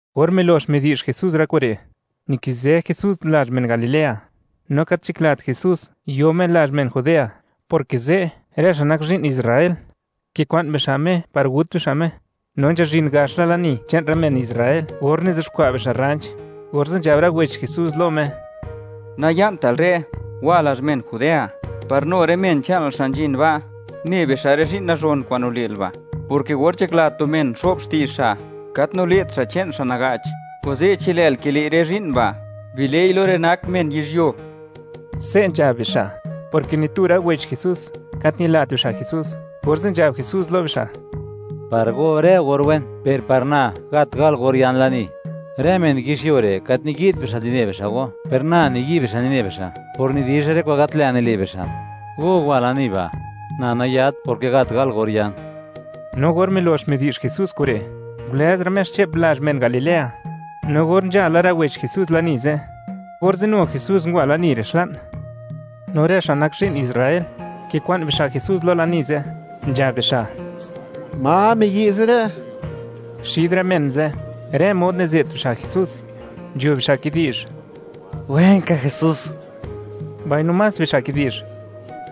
Or milox midi'zh Jesús rë kure', nikizë Jesús lazh men Galilea; no gat nzhaklat Jesús yo Me lazh men Judea, porke ze' rë xa' nak zhi'n Israel kikwa'n bixa' Me par gut bixa' Me, no nzhazhin gax la lani che'n rë men Israel, or nizuxkwa' bixa' rranch, orze' nzhab rë wech Jesús lo Me: ―Naya'ntal re'; wa lazh men Judea, par nu rë men che'nal xa' nzhin ba', ne bixa' rë zhi'n nazhon kwa'n nile'l ba', porke or nzhakla tu men xo'b xti'zh xa', gat nile't xa' che'n xa' naga'ch; kuze' chi lë'l kile' rë zhi'n ba', bile'i lo rë nak men yizhyuo. Se' nzhab bixa', porke ni tu rë wech Jesús, gat ñilat bixa' Jesús. Orze' nzhab Jesús lo bixa': ―Par go rë or wen, per par na gat gal or yan lani. Rë men yizhyuo re', gat niyi't bixa' nine bixa' go; per na niyi' bixa' nine bixa', por nidizha rë kwa'n gat lë' nile' bixa'. Go wa lani ba'. Na nayat, porke gat gal or yan. No or milox midi'zh Jesús kure', ngulëzra' Me xche'p lazh men Galilea. No or nzha la rë wech Jesús lani ze', orze' nu Jesús ngwa lani re' xla'n, no rë xa' nak zhi'n Israel, kikwa'n bixa' Jesús lo lani ze', nzhab bixa': ―¿Ma miyi' ze' re'? Xid rë men ze', rë mod nize't bixa' Jesús, nzho bixa' kidi'zh: “Wenka Jesús”, mbaino más bixa' kidi'zh: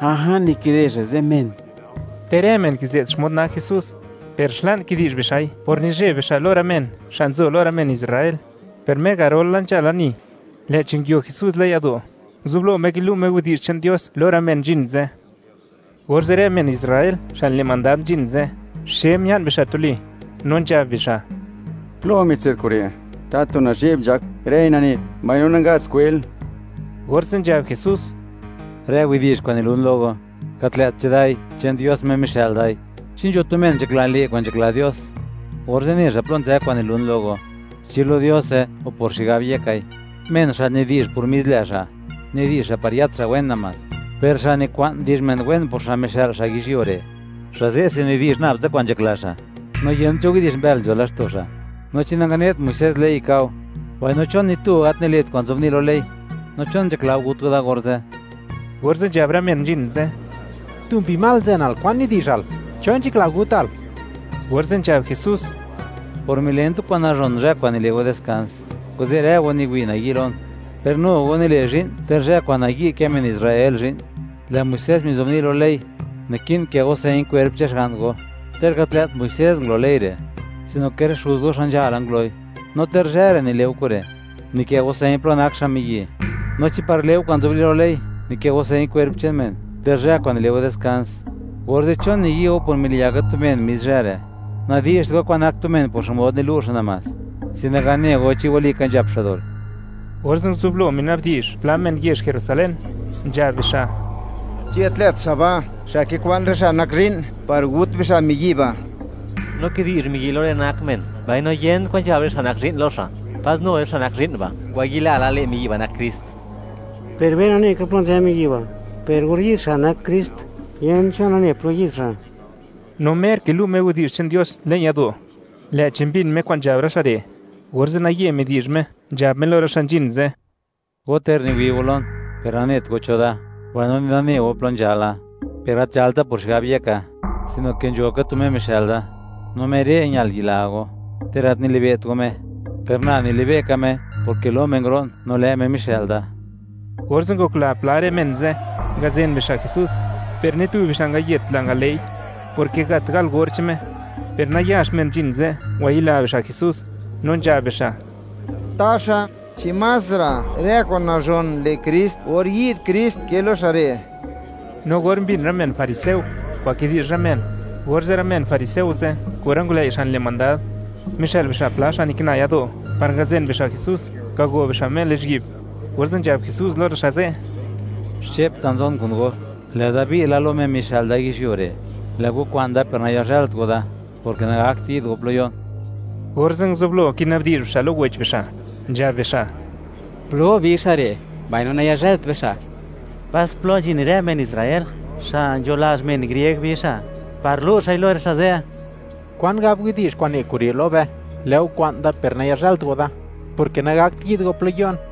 “A'a, nikide xa' ze' men.” Ter rë men kize't xmod nak Jesús, per xla'n kidi'zh bixa'i por nizheb bixa' lo rë men xa' nzo lo rë men Israel, per mer garol la nzha lani, lë'chi nguio Jesús le'n yado', nguzublo Me kilu' Me widi'zh che'n Dios lo rë men nzhin ze', orze' rë men Israel xa' nile' mandad nzhin ze', xe mia'n bixa' tuli no nzhab bixa': ―¿Plo mitse'd kure', tatu nazhe'b nzhak xa', rëi nane xa', mbaino nangat xa' skwel? Orze' nzhab Jesús: ―Rë widi'zh kwa'n nilun lo go, gat lë't chedai; che'n Dios Me mixë'l dai. Chi nzho tu men nzhakla, le' kwa'n nzhakla Dios; orze' ne xa' plo nzë kwa'n nilun lo go; chi lo Diose, o por xigab yekai. Men xa' nidi'zh por mis lë' xa', nidi'zh xa' par yët xa' wen namás; per xa' nikwa'n di'zh men wen por xa' mixë'l xa' yizhyuo re', xa' ze' se nidi'zh nab tsa kwa'n nzhakla xa' mixë'l xa', no yent cho widi'zh mbël nzho laxto' xa'. No, ¿chi nangane't Muisés ley, ka'o? Mbaino, ¿chon ni tu go gat nile't kwa'n nzobni' lo ley? No, ¿chon nzhakla go gut go da orze'? Orze' nzhab rë men nzhin ze': ―¡Tu mbi mal nzenal! ¿Kwan nidi'zhal? ¿Cho nzhakla gutal? Orze' nzhab Jesús: ―Por milen tu kwa'n nazhon, zhë kwa'n nile' go diskans, kuze' rë go niwi' nayi' lon. Per nu go nile' zhi'n, ter zhë kwa'n nayi' kë men Israel zhi'n. Lë' Muisés mizobni' lo ley, naki'n kë' go señ kwerp che'n xga'n go (ter gat lë't Muisés ngulo ley re', sino ke rë xuz go xa' nzhala nguloi), no ter zhë re' nile' go kure', nikë' go señ plo nak xa' miyi'. No chi par le' go kwa'n nzobni' lo ley, nikë' go señ kwerp che'n men, ter zhë kwa'n nile' go diskans; orze', ¿chon niyi' go por miliyaka tu men mis zhë re'? Nadi'zht go kwan nak tu men por xmod nilu' xa' namás, sin naga ne go, chi walika nzhap xa' dol. Orze' nguzublo mina'bdi'zh pla men yezh Jerusalén, nzhab bixa': ―¿Chi gat lë't xa' ba', xa' kikwa'n rë xa' nak zhi'n, par gut bixa' miyi' ba'? No kidi'zh miyi' lo rë nak men, mbaino yent kwan nzhab rë xa' nak zhi'n lo xa'. ¿Pas nu rë xa' nak zhi'n ba', ngwayila la, lë' miyi' ba' nak Krist? Per be nane ka plo nzë miyi' ba'; per or yi'd xa' nak Krist, yent cho nane plo yi'd xa'. No mer kilu' Me widi'zh che'n Dios le'n yado', lë'chi mbin Me kwa'n nzhab rë xa' re', orze' naye midi'zh Me, nzhab Me lo rë xa' nzhin ze': ―Go, ter niwi' go lon, per nanet go cho da, mbaino ni nane go plo nzhala. Per gat nzhalta por xigab yeka, sino ke nzho ka tu Me mixë'l da, no Me re' Me ñal yila go; ter gat nilibe't go Me. Per na nilibe' ka Me, porke lo Me nguro'n, no lë' Me mixë'l da. Orze' ngokla pla rë men ze' ngazen bixa' Jesús, per ni tu bixa' nangayet la ngale'i, porke gat gal or che'n Me, per nayax men nzhin ze' ngwayila bixa' Jesús, no nzhab bixa': ―Taxa, ¿chi másra' rë kwa'n nazhon le' Krist or yi'd Krist ke lo xa' re'? No or mbin rë men fariseo kwa'n kidi'zh rë men, orze' rë men fariseo ze' kun rë ngulëi' xa' nile' mandad, mixë'l bixa' pla xa' nikina yado' par ngazen bixa' Jesús, ngago bixa' Me lizhyi'b, orze' nzhab Jesús lo rë xa' ze': ―Xche'ptsa nzon kun go, lë'da bi' la lo Me mixë'l da yizhyuo re'; lë' go kwa'n da per nayazhë'lt go da, porke nagakt yi'd go plo yo'n. Orze' nguzublo kina'bdi'zh bixa' lo wech bixa', nzhab bixa': ―¿Plo bi xa' re', mbaino nayazhëlt be xa'? ¿Pas plo nzhin rë men Israel, xa' nzho lazh men grieg bi xa', par lu' xa'i lo rë xa' ze'? ¿Kwan gab widi'zh kwa'n ne kure' lo be: “Lë' go kwa'n da per nayazhë'lt go da, porke nagakt yi'd go plo yo'n”?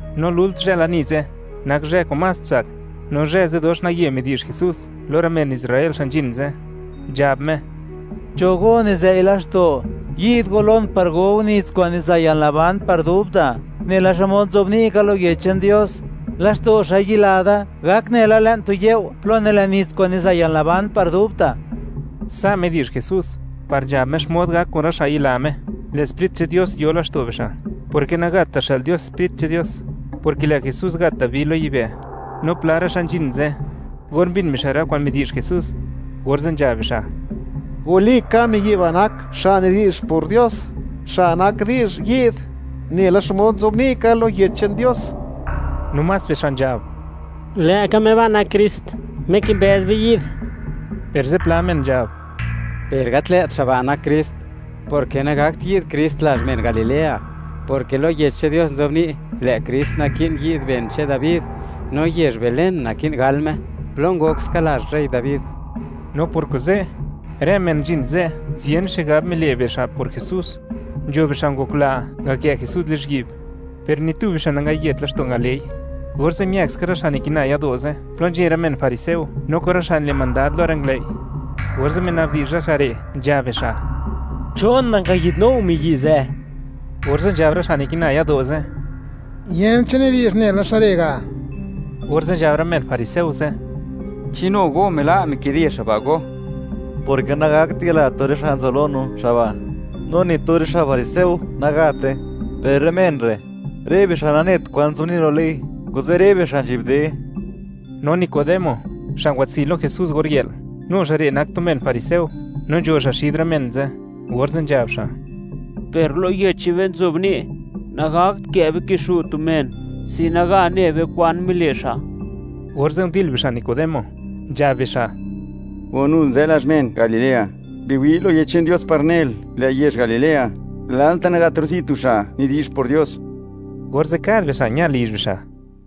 No lult zhë lani ze', nak zhë kwa'n más tsak, no zhë ze' dox naye midi'zh Jesús lo rë men Israel xa' nzhin ze', nzhab Me: ―¡Cho go nizëi' laxto', yi'd go lon par go go nits kwa'n niza' yalnaban par dubta'! Nela xmod nzobni' ka lo Yech che'n Dios, laxto' xa' yila da, gak nela le'n tu you' plo nilen nits kwa'n niza' yalnaban par dubta'. Sa' midi'zh Jesús par nzhab Me xmod gak kun rë xa' yila Me, lë' Sprit che'n Dios yo laxto' bixa'; porke nagata' xë'l Dios Sprit che'n Dios, porke lë' Jesús nagata' bi lo yibë'. No pla rë xa' nzhin ze', or mbin bixa' rë kwa'n midi'zh Jesús, orze' nzhab bixa': ―Walika miyi' ba' nak xa' nidi'zh por Dios, xa' nak di'zh yi'd, nela xmod nzobni' ka lo Yech che'n Dios. No más bixa' nzhab: ―Lë'ka Me ba' nak Krist, Me kimbëz be yi'd. Per zipla men nzhab: ―Per gat lë't xa' ba' nak Krist, porke nagakt yi'd Krist lazh men Galilea, porke lo Yech che'n Dios nzobni', lë' Krist naki'n yi'd ben che'n Dabi, no yezh Belén naki'n gal Me, plo ngok ska lazh rey Dabi. No por kuze', rë men nzhin ze', ziyën xigab mile' bixa' por Jesús. Nzho bixa' ngokla, ngakë' Jesús lizhyi'b, per ni tu bixa' nangayet laxto' ngale'i. Orze' miëkska rë xa' nikina yado' ze', plo nzhin rë men fariseo, no kun rë xa' nile' mandad lo rë ngulëi', orze' mina'bdi'zh rë xa' re', nzhab bixa': ―¿Chon nangayi'dnu go miyi' ze'? Orze' nzhab rë xa' nikina yado' ze': ―¡Yent cho nidi'zh nela xa' re' ga'! Orze' nzhab rë men fariseo ze': ―¿Chi nu go mila' mikide xa' ba' go? Porke nagat yila tu rë xa' nzo lo no xa' ba', no ni tu rë xa' fariseo, nagate. ¡Per rë men re', rë bixa' nanet kwan nzobni' lo ley, kuze' rë bixa' nzhi'bde! No Nicodemo, xa' ngwatsi' lo Jesús or yë'l, nu xa' re' nak tu men fariseo no nzho xa' xid rë men ze'; orze' nzhab xa': ―Per lo yech che'n be nzobni', nagakt kë' be kixu' tu men sin naga ne be kwan mile' xa'. Orze' ndil bixa' Nicodemo, nzhab bixa': ―¡O nul nzë lazh men Galilea! Biwi' lo Yech che'n Dios par nel, lë' yezh Galilea, lalta' nagat rozi' tu xa' nidi'zh por Dios. Orze' kad bixa' ña lizh bixa'.